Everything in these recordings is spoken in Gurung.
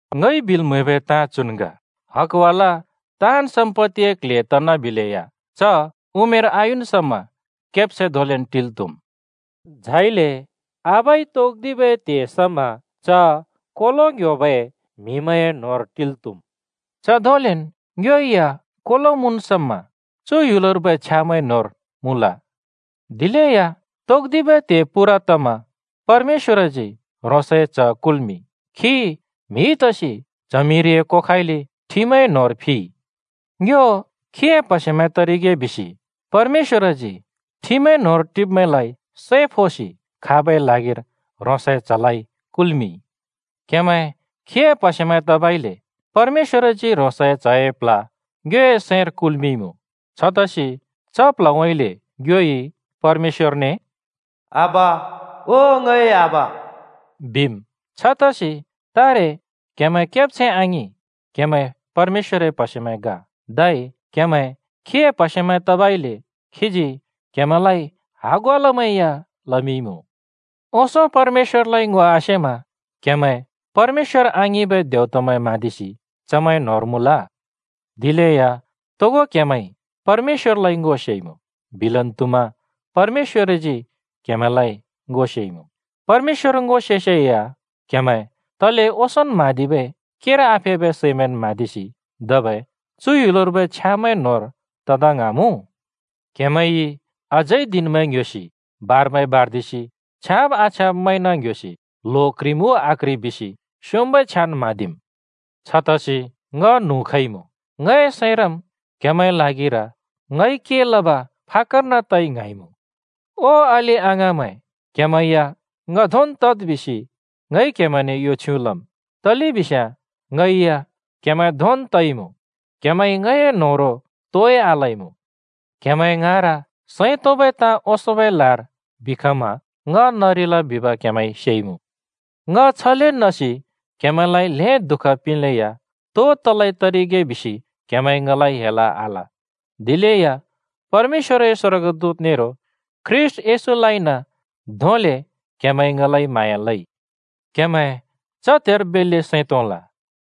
ङइ बिल् म्हैबै ताँ चुन् ग: हकवाला ताँन् सम्‍पत्तिए क्‍ल्‍हे तनाबिलेया च उमेर आयुन् समा केब्छैं धोंलेन् टिल् त्‍हुम्। झाइले आबाइ तोक्दिबै त्हे समा च कोलो ङ्ह्‍योबै म्हिमैंए न्होंर टिल् त्‍हुम्। च धोंलेन् ङ्यो या कोलो मुँन् समा चु ह्‍युलर्बै छ्यामैंए न्होंर मुँल। दिलेया तोक्दिबै त्हे पूरा तमा परमेश्‍वरजी ह्रोंसए च्‍ह कुल्‍मिंइ। खी म्‍हि तसि च्हमिरिए कोखाउँइँले ठिमए न्होंर फिइ। ङ्यो खीए प्हसेमैं तरिगे बिसि परमेश्‍वरजी ठिमए न्होंर टिब्‍मैंलाइ सै फोसि खाबै ल्हागिर ह्रोंसए च्हलाइ कुल्मिंइ। क्‍हेमैं खीए प्हसेमैं तबइले परमेश्‍वरजी ह्रोंसए च्‍हए प्ल्ह ङ्योए सैंर कुल्‍मिंइमुँ। छतसि च प्ल्हउँइँले ङ्योइ परमेश्‍वरने “आबा, ओ ङए आबा” बिम्। छतसि तारे क्हेमैं केब्छैं आङिं, क्हेमैं परमेश्‍वरए प्हसेमैं ग। धै क्हेमैं खीए प्हसेमैं तबइले खीजी क्हेमैंलाइ हगवालामैं या लमिंइमुँ। ओंसों परमेश्‍वरलाइ ङो आसेमा क्‍हेमैं परमेश्‍वर आङिंबै देवतामैं म्हाँदिसि चमैंए न्होंर मुँल। दिलेया तोगो क्‍हेमैंइ परमेश्‍वरलाइ ङो सेइमुँ - बिलन् त्हुमा: परमेश्‍वरजी क्‍हेमैंलाइ ङो सेइमुँ। परमेश्‍वर ङो सेसेया क्‍हेमैं तले ओंसोंन् म्हाँदिबै केर आफेबै सैमैंन् म्हाँदिसि धबै चु ह्‍युलर्बै छ्यामैंए न्होंर तदा ङ्हाँमुँ? क्‍हेमैंइ अझै दिनमैं ङ्ह्‍योसि, बारमैं बार्दिसि, छ्याँब आछ्याँब म्हैंन ङ्‍ह्‍योसि, ल्हो क्ह्रिम् उ आक्ह्रि बिसि स्योंम्बै छ्यान् म्हाँदिम्! छतसि ङ न्हुँ खइमुँ! ङए सैंरम् क्‍हेमैंए ल्हागिर ङइ के लब फाक्‍कर्न तइ ङ्हाँइमुँ। ओ अलि-अङाँमैं, क्‍हेमैं या ङ धोंन् तद् बिसि ङइ क्‍हेमैंने यो छ्युँ लम्। तलेबिस्याँ ङै या क्‍हेमैं धोंन् तइमुँ। क्‍हेमैंइ ङए न्होह्रों तोइ आलइमुँ। क्हेमैं ङाँर सैं तोंबै ताँ ओंसोंबै लार बिखमा ङ नरिल बिब क्‍हेमैंइ सेइमुँ। ङ छले नसि क्‍हेमैंलाइ ल्हें दुःख पिंलेया तो तलै तरिगे बिसि क्‍हेमैंइ ङलाइ हेल आल, दिलेया परमेश्‍वरए स्वर्गदूत नेरो ख्रीष्‍ट येशूलाइन धोंले क्‍हेमैंइ ङलाइ म्हाँया लइ। क्‍हेमैं च त्हेर बेल्‍ले सैं तोंल।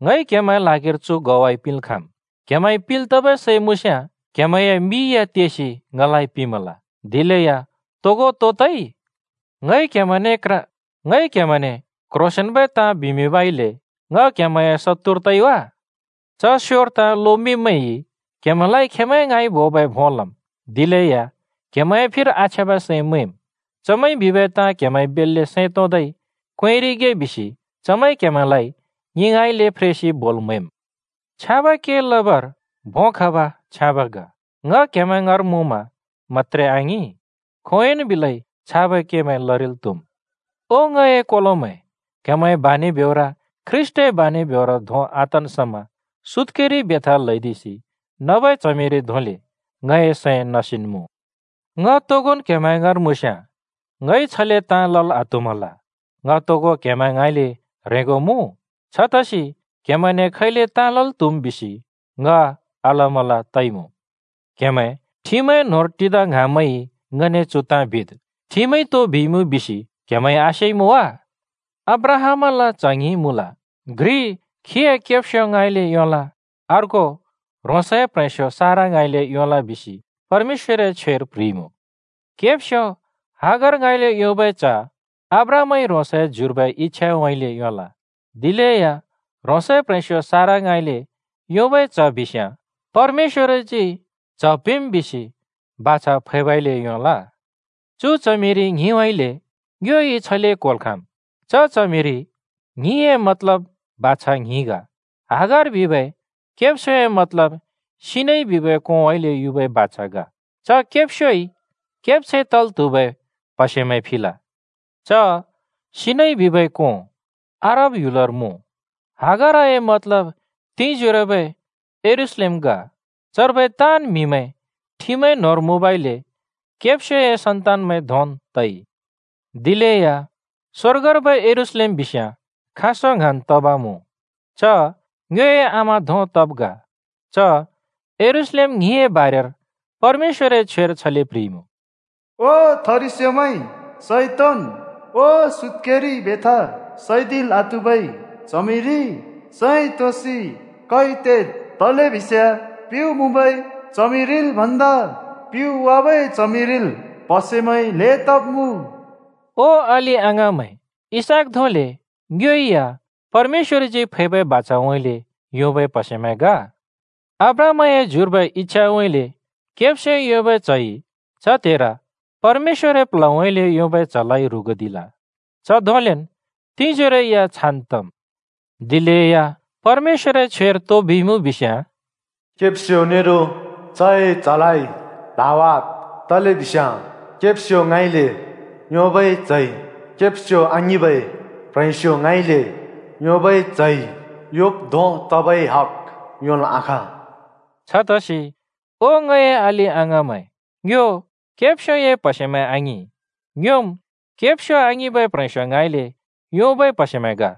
ङइ क्‍हेमैंए ल्हागिर चु ग्वाइ पिंल् खाँम्: क्‍हेमैंइ पिंल् तबै सै मुँस्याँ क्‍हेमैंए मिइ या तेसि ङलाइ पिंमल! दिलेया तोगो तो तइ? ङइ क्‍हेमैंने क्ह्रोसेंन्बै ताँ बिमिंबइले ङ क्‍हेमैंए शत्तुर तइ वा? च स्‍योर ताँ लोमिंब्‍मैंइ क्‍हेमैंलाइ खेंमैं ङाँइ बोबै भों लम्, दिलेया क्हेमैंए फिर आछ्याँबै सैं मैंम्। चमैंइ बिबै ताँ क्‍हेमैंइ बेल्‍ले सैं तोंदै क्वेंरिगे बिसि चमैंइ क्‍हेमैंलाइ ङि ङाँइँले फ्रेसि बोल् म्‍हैम्। छ्याँबै के लबर भों खब छ्याँब् ग। ङ क्हेमैं ङाँर मुँमा मत्‍त्रे आङिं, खोंयोंन् बिलै छाबै केमैं लरिल् त्हुम्। ओ, ङए कोलोमैं, क्‍हेमैंए बानि ब्योर ख्रीष्‍टए बानि ब्योर धों आतन् समा सुत्‍केरि बेथा ल्‍हैदिसि नबै च्हमिरि धोंले ङए सैं नसिन् मुँ। ङ तोगोन् क्‍हेमैं ङाँर मुँस्याँ ङइ छले ताँ लल् आत्हुमल। ङ तोगो क्हेमैं ङाँइले ह्रेंगो मुँ, छतसि क्‍हेमैंने खैले ताँ लल् त्हुम् बिसि ङ अलमल् तइमुँ। क्‍हेमैं ठिमए न्होंर टिदा ङ्हाँब्‍मैंइ ङने चु ताँ बिद्: ठिमइ तो बिइमुँ बिसि क्‍हेमैंइ आसेइमुँ वा? अब्राहामल च्‍ह ङ्हिं मुँल। घ्रि खीए केब्स्यो ङाँइँले योंल, अर्को ह्रोंसए प्‍ह्रेंस्‍यो सारा ङाँइँले योंल बिसि परमेश्‍वरए छ्वेर प्‍ह्रिइमुँ। केब्स्‍यो हागार ङाँइँले योंबै च्ह अब्राहामइ ह्रोंसए ज्युर्बै इच्छाउँइँले योंल। दिलेया ह्रोंसए प्‍ह्रेंस्‍यो सारा ङाँइँले योंबै च्ह बिस्याँ परमेश्‍वरजी च्ह पिंम् बिसि बाछा फैबइले योंल। चु च्हमिरि ङ्हिंउँइँले ङ्योइ छले क्होल् खाँम्: च च्हमिरि ङ्हिंए मतलब बाछा ङ्हिं ग। हागार बिबै केब्स्‍योए मतलब सिनै बिबै कोंउँइँले युबै बाछा ग। च केब्स्‍योइ केब्छैं तल् त्हुबै प्‍हसेमैं फिल। च सिनै बिबै कों अरब ह्‍युलर मुँ। हागारए मतलब तिंजोरोबै यरूशलेम ग। चर्बै ताँन् म्हिमैं ठिमए न्होंर मुँबइले केब्स्योए सन्तानमैं धोंन् तइ। दिलेया स्‍वर्गर्बै यरूशलेम बिस्याँ खाँसों ङ्हाँन् तब मुँ। च ङ्योए आमा धों तब् ग। च यरूशलेम ङ्हिंए बारेर परमेश्‍वरए छ्वेर छले प्‍ह्रिइमुँ, “ओ थरिस्योमैं, सैं तोंन्! ओ सुत्‍केरि बेथा सैदिल् आत्हुबै च्हमिरि, सैं तोंसि कै तेद्! तलेबिस्याँ प्युँ मुँबै च्हमिरिल् भन्दा प्‍युँइ वाबै च्हमिरिल् प्‍हसेमैं ल्‍हें तब्मुँ।” ओ अलि-अङाँमैं, इसहाक धोंले ङ्यो या परमेश्‍वरजी फैबै बाछाउँइँले योंबै प्हसेमैं ग। अब्राहामए ज्युर्बै इच्छाउँइँले केब्स्योइ योंबै च्‍हइ च त्हेर परमेश्‍वरए प्ल्हउँइँले योंबै च्‍हलाइ ह्रुगुदिल। च धोंलेन् तिंजोरो या छान् तम्। दिलेया परमेश्‍वरए छ्वेर तो बिइमुँ बिस्‍याँ “केब्स्‍यो नेरो चए च्‍हलाइ ल्हावाद्, तलेबिस्याँ केब्स्यो ङाँइँले योंबै च्‍हइ, केब्स्यो आङिंबै प्‍ह्रेंस्‍यो ङाँइँले योंबै च्‍हइ योंब् धों तबै हक योंल् आखाँ।” छतसि ओ ङए अलि-अङाँमैं, ङ्यो केब्स्‍योए प्‍हसेमैं आङिं, ङ्योम् केब्स्यो आङिंबै प्ह्रेंस्यो ङाँइँले योंबै प्‍हसेमैं ग।